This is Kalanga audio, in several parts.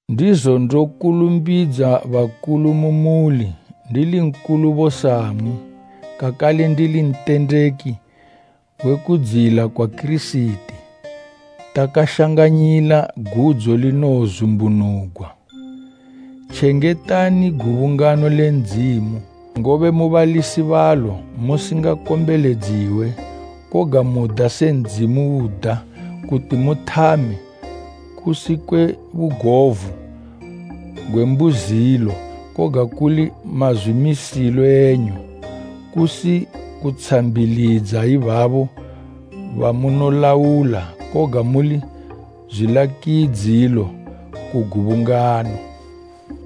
Ndizo ndokulumbidza bakulu mu muli, ndili nkulubo samwi, kakale ndili ntendeki we kudziyila kwa Kirisiti, takashanganyila gudzo linowozumbunugwa. Tjengetani gubungano le Ndzimu, ngobe mu balisi balo musingakombeledziwe, koga muda se Ndzimu uda kuti muthame, kusi kwe bugovu gwe mbuzilo koga kuli mazwimisilo enyu, kusi kutshambilidza ibabo bamunolaula, koga muli zwilakidzilo ku gubungano.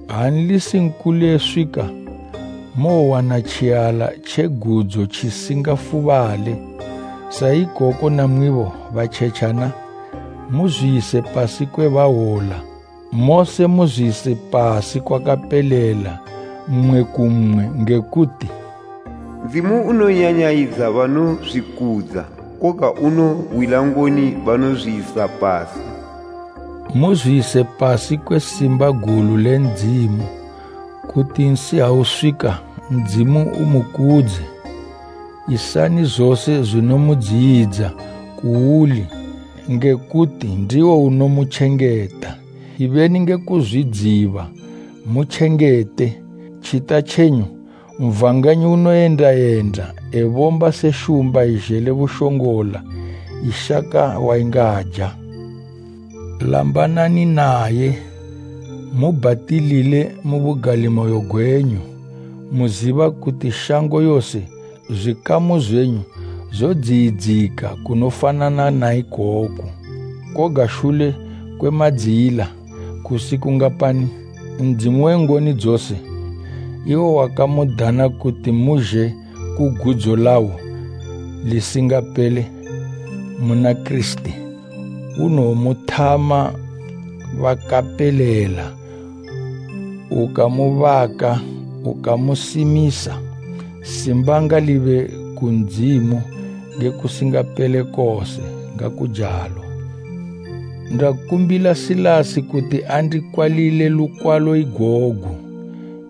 Ha Nlisi nkulu eswika, mowowana tjiala tje gudzo tjisingafubale. Sa ikoko namwibo batjetjana, muzwiyise pasi kwe bahwola. Mose muzwiyise pasi kwakapelela mmwe ku mmwe nge kuti “Ndzimu unonyanyayidza banozwikudza, koga unohwila ngoni banozwiyisa pasi.” Muzwiyise pasi kwe simba gulu le Ndzimu, kuti nsi ha uswika Ndzimu umukudze. Isani zose zwinomudziyidza kuuli, nge kuti ndiwo unomutjengeta. Ibeni nge kuzwidziba, mutjengete. Tjita tjenyu Satani tjoyenda yenda tjibomba se shumba izhele bushongola, tjishaka watjingaja. Lambanani natjo, mubhatilile mu bugalimoyo gwenyu, muziba kuti shango yose zwikamu zwenyu zodziyidzika kunofanana na ikoku. Koga shule kwe madziyila kusi kungapani, Ndzimu we ngoni dzose, iwo wakamudana kuti muzhe ku gudzo lawo lisingapele muna Kirisiti, unowomuthama bakapelela, ukamubaka, ukamusimisa. Simba ngalibe ku Ndzimu nge kusingapele kose. Ngakujalo. Ndakumbila Silasi kuti andikwalile lukwalo igogu.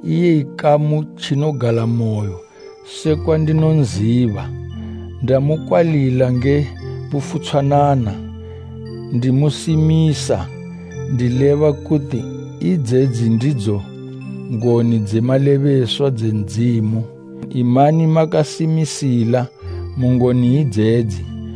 Iye ikamu tjinogalamoyo sekwa ndinonziba, ndamukwalila nge bufutshwanana, ndimusimisa ndileba kuti idzedzi ndidzo ngoni dze malebeswa dze Ndzimu. Imani makasimisila mu ngoni idzedzi.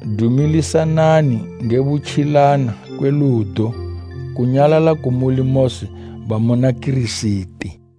Dumilisanani nge butjilana kwe ludo. Kunyalala kumuli mose bamuna Kirisiti.